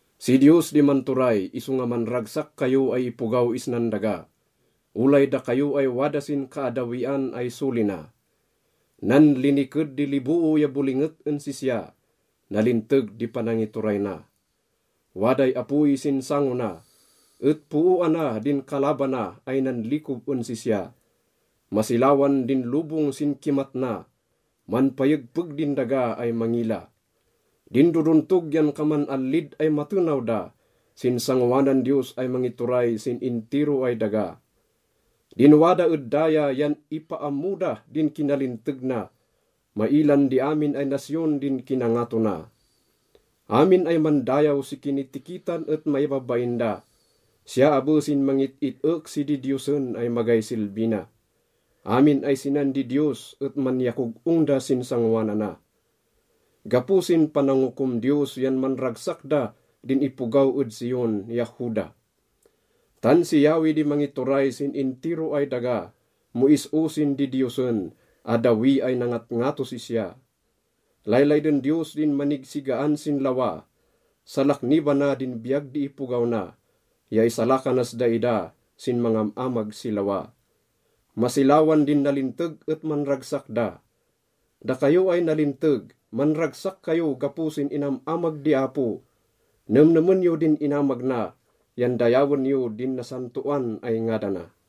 Si Diyos di manturay isonga manragsak kayo ay ipogaw isnan daga, olay dakayo ay wada sin kaaddawian ay soli na. Nanliniked di liboo ya bolinget en sisya, nalinteg di panangituray na. Waday apoy sin sango na, et pooana din kalabana ay nanlikob en sisya. Masilawan din lobong sin kimat na, manpayegpeg din daga ay mangila. Din dodontog yan kaman allid ay matenaw da sin sangoanan Diyos ay mangituray sin intiro ay daga. Din wada ed daya yan ipaammo da din kinalinteg na, mailan di amin ay nasyon din kinangato na. Amin ay mandayaw si kinitikitan et maibabain da, siya abe sin mangit-it-ek si didiyosen ay magay silbi na. Amin ay sinan didiyos et manyakog-ong da sin sangoanana. Gapo sin panangokom Diyos yan manragsak da din ipogaw ed Zion ya Juda. Tan si Yahweh di mangituray sin intiro ay daga, mo is-o sin didiyosen, addawi ay nangatngatos sisya. Laylayden Diyos din manigsigaan sin lawa, salaknibana din biyag di ipogaw na ya isalakanas daida sin mangam-amag si lawa. Masilawan din nalinteg et manragsak da. Dakayo ay nalinteg, manragsak kayo gapo sin inam-amag di Apo. Nemnemen yo din inamag na, yan dayawen yo din nasantoan ay ngadana.